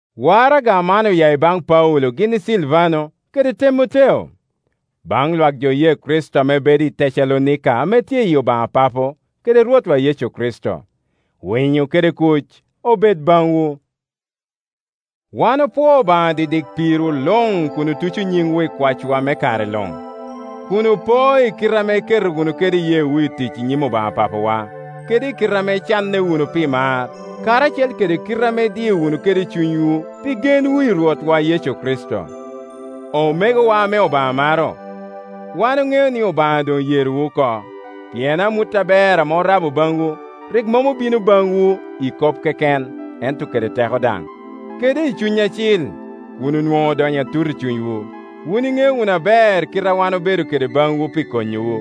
Waraga man oya i baŋ Paulo gin i Silvano, kede Temoteo. Baŋ Iwak jo oye Kricito ame bedo i Tecalonika ame tye i Obaŋa Papo kede Rwotwa Yecu Kricito; Winyo kede kuc obed baŋwu. Wan opwoo Obaŋa didik pirwu luŋ kun otuco nyiŋwu i kwacwa me kare luŋ, kun opoo i kite ame iketo wunu kede iyeewu i tic i nyim Obaŋa Papawa, kede kite ame icanne wunu pi mar, karacel kede kite ame idio wunu kede cunywu pi genwu i Rwotwa Yecu Kricito. Omegowa ame Obaŋa maro, wan oŋeo ni Obaŋa doŋ oyerowu oko, pien amut aber ame orabo baŋwu, rik mom obino baŋwu i kop keken ento kede teko daŋ, kede i Cuny Acil, kun onwoŋo odonyo atut i cunywu. Wun iŋeo wunu aber kite ame wan obedo kede baŋwu pi konyowu.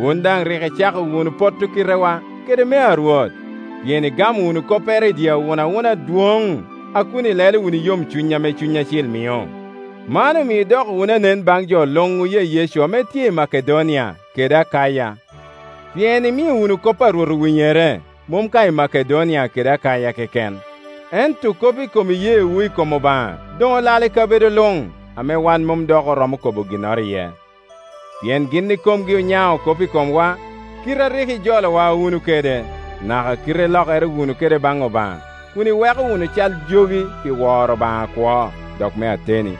Wun daŋ rik icako wunu potto kitewa kede mea Rwot, pien igamo wunu koppere i dye awunawuna adwoŋ a kun ilelo wunu i yomcuny ame Cuny Acil mio. Man omio idoko wunu anen baŋ jo luŋ oye Yecu ame tye i Makedonia kede Akaya. Pien imio wunu kop a Rwot owinyere, mom ka i Makedonia kede Akaya keken, ento kop i kom iyeewu i kom Obaŋa doŋ olal i kabedo luŋ, ame wan mom dok oromo kobo ginnoro iye. Pien gin ikomgi onyao kop i komwa, kite a rik ijolowa wunu kede, naka kite ilokere wunu kede baŋ Obaŋa, kun iweko wunu cal jogi pi woro Obaŋa akwo, dok me ateni,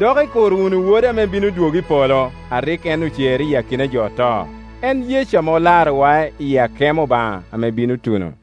dok ikuro wunu Wode ame bino dwogo i polo, a rik en ocero iya i akina jo oto, en Yecu ame olarowa i akemo Obaŋa ame bino tuno.